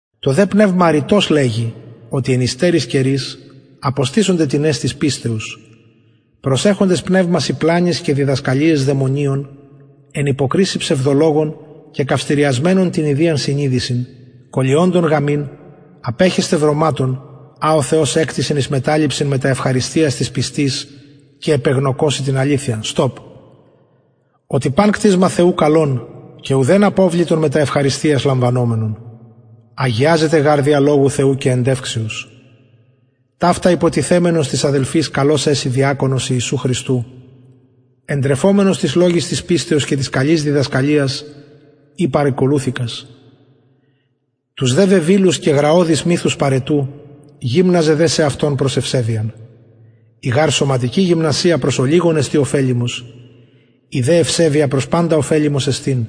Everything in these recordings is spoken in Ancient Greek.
το δε πνευμα ρητως λεγει οτι εν υστεροις καιροις αποστησονται τινες της πιστεως προσεχοντες πνευμασιν πλανοις και διδασκαλιαις δαιμονιων εν υποκρισει ψευδολογων κεκαυτηριασμενων την ιδιαν συνειδησιν κωλυοντων γαμειν απεχεσθαι βρωματων α ο θεος εκτισεν εις μεταληψιν μετα ευχαριστιας τοις πιστοις και επεγνωκοσιν την αληθειαν οτι παν κτισμα θεου καλον και ουδεν αποβλητον μετα ευχαριστιας λαμβανομενον αγιαζεται γαρ δια λογου θεου και εντευξεως ταυτα υποτιθεμενος τοις αδελφοις καλος εση διακονος ιησου χριστου εντρεφομενος τοις λογοις της πιστεως και της καλης διδασκαλιας η παρηκολουθηκας τους δε βεβηλους και γραωδεις μυθους παραιτου γυμναζε δε σεαυτον προς ευσεβειαν η γαρ σωματικη γυμνασια προς ολιγον εστιν ωφελιμος η δε ευσεβεια προς παντα ωφελιμος εστιν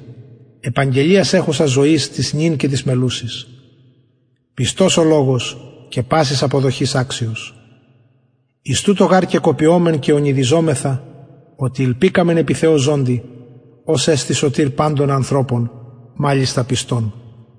επαγγελιαν εχουσα ζωης της νυν και της μελλουσης πιστος ο λογος και πασης αποδοχης αξιος εις τουτο γαρ και κοπιωμεν και ονειδιζομεθα οτι ηλπικαμεν επι θεω ζωντι ος εστιν σωτηρ παντων ανθρωπων μαλιστα πιστων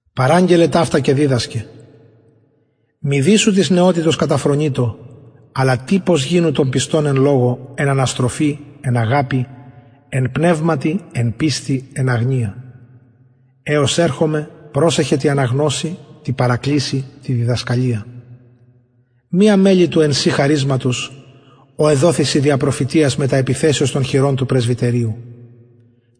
παραγγελλε ταυτα και διδασκε μηδεις σου της νεοτητος καταφρονειτω αλλα τυπος γινου των πιστων εν λογω εν αναστροφη εν αγαπη εν πνευματι εν πιστει εν αγνεια εως ερχομαι προσεχε τη αναγνωσει τη παρακλησει τη διδασκαλια μη αμελει του εν σοι χαρισματος ο εδοθη σοι δια προφητειας μετα επιθεσεως των χειρων του πρεσβυτεριου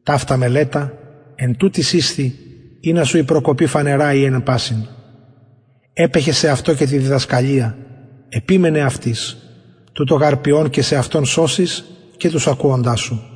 ταυτα μελετα εν τουτοις ισθι ινα σου η προκοπη φανερα η εν πασιν επεχε σεαυτω και τη διδασκαλια επιμενε αυτοις τουτο γαρ ποιων και σεαυτον σωσεις και τους ακουοντας σου